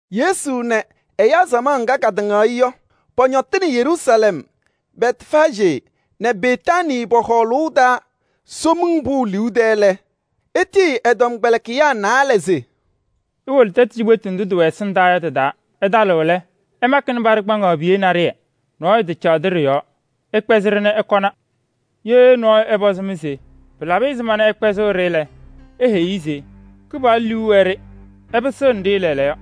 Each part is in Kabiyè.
Yesu nɛ ɛyaa samaɣ ŋga katɩŋaɣ-ɩ yɔ, pɔñɔtɩnɩ Yeruusalɛm Bɛtfaajee nɛ Betaanii pɔ-hɔɔlʋʋ taa Somiŋ Pʋʋ liu tɛɛ lɛ, etiyi ɛ-tɔmkpɛlɩkɩyaa naalɛ se: “Iwolo tɛtʋ cikpetu ndʋ tɩwɛ ɛsɩndaa yɔ tɩ-taa. Ɩtalɩɣ lɛ, ɩmakɩnɩ paɖɩ kpaŋaɣ piye naɖɩyɛ. Nɔɔyʋ tacaɣdɩ ɖɩ-yɔɔ. Ɩkpɛzɩ-ɖɩ nɛ ɩkɔna. Ye nɔɔyʋ ɛpɔzɩ-mɩ se: ‘Pɩlabɩ ɛzɩma nɛ ɩkpɛzɩɣ-ɖɩ’ lɛ, iheyi-i se: ‘Kɩpaɣlʋ liu wɛ-ɖɩ, ɩpɩsɩɣnɩ-ɖɩ lɛɛlɛɛyɔ.’”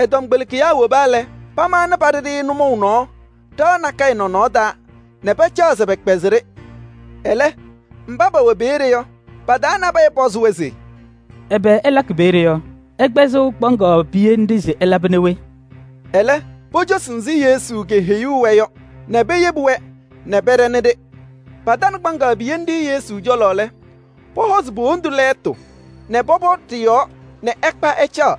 Ɛ-tɔmkpɛlɩkɩyaa woba lɛ, pamaɣnɩ paɖɩ-ɖɩ nʋmɔʋ nɔɔ ɖɩɣa nakɛyɛ nɔnɔɔ taa nɛ pacaɣ se pɛkpɛzɩ-ɖɩ. Ɛlɛ mba pɛwɛ peeye yɔ, pa-taa nabɛyɛ pɔzɩ-wɛ se: “Ɛbɛ ɩlakɩ peeye yɔ? Ɩkpɛzɩɣ kpaŋaɣ piye nɖɩ se ɩlabɩnɩ we?” Ɛlɛ, pocosi ɛzɩ Yesu keheyuu-wɛ yɔ nɛ peyebi-wɛ nɛ pɛɖɛnɩ-ɖɩ. Patanɩ kpaŋaɣ piye nɖɩ Yesu cɔlɔ lɛ, pɔhɔzɩ po-wondu lɛɛtʋ nɛ pɔpɔ ɖɩ-yɔɔ nɛ ɛkpa ɛcaɣ.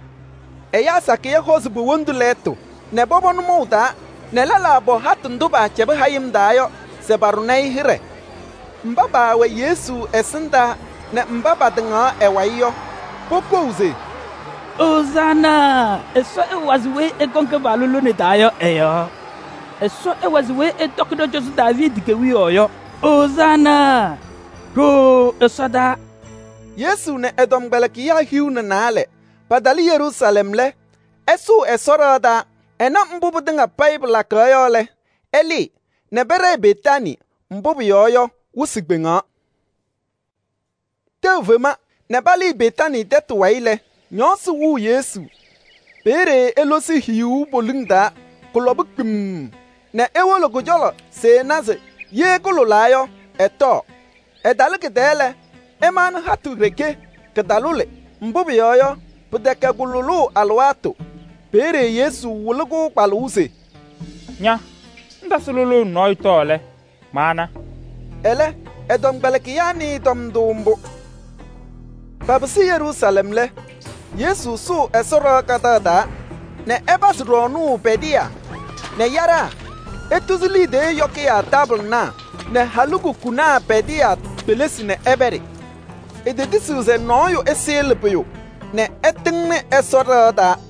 Ɛyaa sakɩyɛ hɔzɩ po-wondu lɛɛtʋ nɛ pɔpɔ nʋmɔʋ taa nɛ lɛlaa pɔ hatʋ ndʋ paacɛbɩ hayɩm taa yɔ se paɖʋ-ɩ hɩɖɛ. Mba paawɛ Yesu ɛsɩndaa nɛ mba patɩŋaɣ ɛ-wayɩ yɔ, pokou se: “Ozaana! Ɛsɔ ɛwazɩ weyi ɛkɔŋ Kɩpaɣlʋ lone taa yɔ ɛ-yɔɔ. Ɛsɔ ɛwazɩ weyi ɛtɔkɩ ɖɔ-cɔzɔ Daaviidi kewiyaɣ yɔ ɛ-yɔɔ. Ozaana! Ɖooo ɛsɔdaa.” Yesu nɛ ɛ-tɔmkpɛlɩkɩyaa hiu nɛ naalɛ patalɩ Yeruusalɛm lɛ, ɛsʋʋ Ɛsɔ ɖɩɣa taa. Ɛna mbʋ pɩtɩŋa payɩ pɩlakaɣ yɔ lɛ, ɛlɩɩ nɛ pɛɖɛɛ Betaanii. Mbʋ pʋyɔɔ yɔ, wɩsɩ kpɛdɛsaa. Tɛʋ fema nɛ palɩɩ Betaanii tɛtʋ wayɩ lɛ, ñɔɔsɩ wɩɣ Yesu. Peeye elosi hiyuu poliŋ taa, kʋlɔba kpemm nɛ ewolo kʋ-cɔlɔ se ɛna se ye kʋlʋlaa yɔ, ɛtɔɔ. Ɛtalɩ kɩ-tɛɛ lɛ, ɛmaɣnɩ hatʋ ɖeke, kɩtalʋlɩ. Mbʋ pʋyɔɔ yɔ, pɩtɛkɛ kʋ-lʋlʋʋ alɩwaatʋ. Peeye Yesu wɩlɩ-kʋ kpalʋʋ se: “Ña! Ŋtasɩ lʋlʋʋ nɛ nɔɔyʋ tɔɔ lɛ, maana.” Ɛlɛ, ɛ-tɔmkpɛlɩkɩyaa nɩɩ tɔm ndʋ mbʋ. Papɩsɩ Yeruusalɛm lɛ, Yesu sʋʋ Ɛsɔ ɖɩɣa kadaɣ taa nɛ ɛpazɩ ɖɔɔnʋʋ pɛdɩyaa nɛ yaɖaa. Etuzi liidiye yɔkɩyaa taabɩlɩnaa nɛ halikukunaa pɛdɩyaa kpelisi nɛ ɛpɛɖɩ. Etetisiɣ se nɔɔyʋ ɛsɩɣlɩ pʋyʋ nɛ ɛtɩŋnɩ Ɛsɔ ɖɩɣa taa.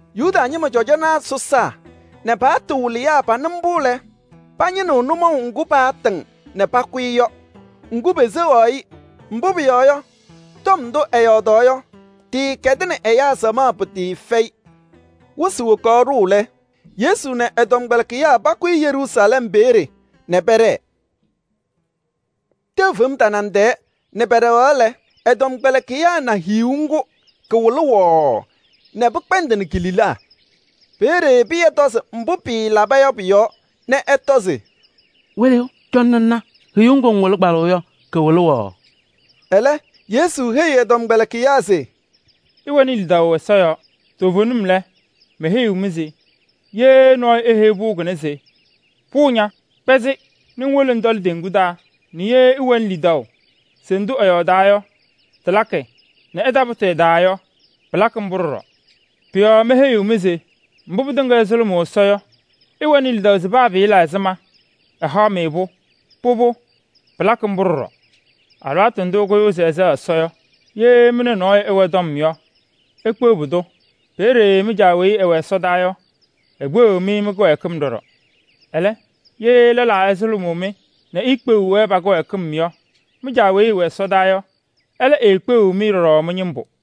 Yuda ñɩma cɔjɔnaa sɔsaa nɛ pa-paɣtʋ wɩlɩyaa panɩ mbʋ lɛ, pañɩnɩɣ nʋmɔʋ ŋgʋ paatɩŋ nɛ pakʋ-ɩ yɔ. Pʋcɔ peseɣaɣ-ɩ, mbʋ pʋyɔɔ yɔ, tɔm ndʋ ɛyɔɔdaɣ yɔ, tɩɩkɛdɩnɩ ɛyaa samaɣ pɩtɩɩfɛyɩ. Wɩsɩ wokaɣ ɖʋʋ lɛ, Yesu nɛ ɛ-tɔmkpɛlɩkɩyaa pakʋyɩ Yeruusalɛm peeye nɛ pɛɖɛɛ. Tɛʋ fem tanaŋ tɛɛ nɛ pɛɖɛɣ lɛ, ɛ-tɔmkpɛlɩkɩyaa na hiyuu ŋgʋ, kɩwɩlɩ wɔɔɔ nɛ pɩkpɛndɩnɩ ki-lila. Peeye Pɩyɛ tɔzɩ mbʋ pɩɩlaba yɔ pʋ-yɔɔ nɛ ɛtɔ se: “Wɩlɩyʋ, cɔnɩ ŋna hiyuu ŋgʋ ŋwɩlɩ kpalʋʋ yɔ kɩwɩlʋʋ wɔɔɔ.” Ɛlɛ, Yesu heyi ɛ-tɔmkpɛlɩkɩyaa se: “Ɩwɛnɩ lidaʋ Ɛsɔ yɔɔ. Toovenim lɛ, meheyiɣ-mɩ se ye nɔɔyʋ eheyi pʋʋ kʋnɛ se: ‘Pʋʋ ña, kpɛzɩ nɛ ŋwolo ŋtɔlɩ teŋgu taa’ nɛ ye ɛwɛnɩ lidaʋ se ndʋ ɛyɔɔdaa yɔ tɩlakɩ nɛ ɛtapʋtɩ ɛ-taa yɔ, pɩlakɩ mbʋ ɖɔɖɔ. Pʋ-yɔɔ meheyiɣ-mɩ se mbʋ pɩtɩŋa ɩsʋlʋmʋʋ Ɛsɔ yɔ, ɩwɛnɩ lidaʋ se paa pɩɩla ɛzɩma, ɛhaɣ-mɩ-pʋ. Pʋbʋ, pɩlakɩ mbʋ ɖɔɖɔ. Alɩwaatʋ ndʋ ɩkʋyʋʋ se ɩsɛɣ Ɛsɔ yɔ, ye mɩ nɛ nɔɔyʋ ɩwɛ tɔm yɔ, ikpeɣ pʋdʋ. Peeye mɩ-Caa weyi ɛwɛ ɛsɔdaa yɔ, ekpeɣiɣ-mɩ mɩ-kɩwɛɛkɩm ɖɔɖɔ. [ Ɛlɛ, ye lɛlaa ɛyʋsʋʋnɩ-mɩ nɛ iikpeɣiɣ-wɛ pa-kɩwɛɛkɩm yɔ, mɩ-Caa weyi ɛwɛ ɛsɔdaa yɔ, ɛlɛ eekpeɣiɣ-mɩ ɖɔɖɔ mɩ-ñɩmbʋ.]”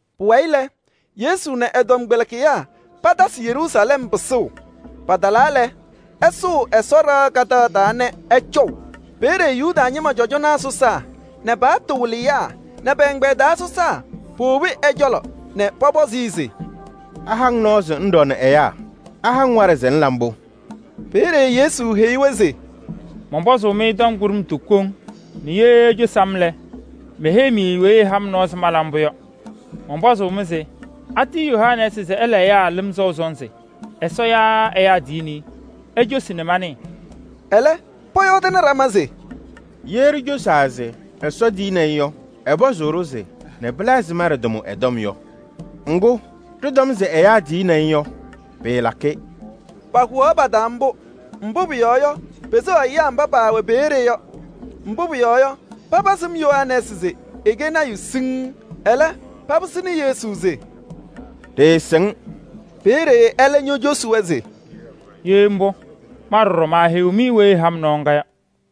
Pʋwayɩ lɛ, Yesu nɛ ɛ-tɔmkpɛlɩkɩyaa patasɩ Yeruusalɛm pɩsʋʋ. Patalaa lɛ, ɛsʋʋ Ɛsɔ ɖɩɣa kadaɣ taa nɛ ɛcɔʋ. Peeye Yuda ñɩma cɔjɔnaa sɔsaa nɛ pa-paɣtʋ wɩlɩyaa nɛ pɛ-ɛgbɛyɛ taa sɔsaa powobi ɛ-cɔlɔ nɛ pɔpɔzɩ-ɩ se: “Aha-ŋ nɔɔ se ŋɖɔɔnɩ ɛyaa? Aha-ŋ waɖɛ se ŋla mbʋ?” Peeye Yesu heyi-wɛ se: “Mɔnpɔzʋʋ-mɩ tɔm kʋɖʋmtʋ koŋ nɛ ye icosi-m lɛ, meheyi-mɩ weyi ɛha-m nɔɔ se mala mbʋ yɔ. Mɔnpɔzʋʋ-mɩ se: atiyi Yohanɛɛsɩ se ɛla ɛyaa lɩm sɔʋ sɔnzɩ? Ɛsɔ yaa ɛyaa tiyini-i? Icosi nɛ manɩɩ.” Ɛlɛ, pɔyɔɔdɩnɩ ɖama se: “Ye ɖicosaa se: ‘Ɛsɔ tiyini-i’ yɔ, ɛpɔzʋʋ-ɖʋ se: ‘Nɛ pɩla ɛzɩma ɖɩtamʋ ɛ-tɔm yɔ?’ Ŋgʋ, ɖɩtɔm se: ‘Ɛyaa tiyini-i’ yɔ, pɩɩlakɩ.” Pahʋwaɣ pa-taa mbʋ, mbʋ pʋyɔɔ yɔ, peseɣaɣ ɛyaa mba se pasɩm Yohanɛɛsɩ se ɛkɛ lɔɔyaɣ tʋ siŋŋ. Ɛlɛ papɩsɩnɩ Yesu se: “Ɖɩɩsɩŋ.” Peeye ɛlɛ ñocosi-wɛ se: “Ye mbʋ, ma ɖɔɖɔ maaheyiɣ-mɩ weyi ɛha-m nɔɔ ŋga yɔ.”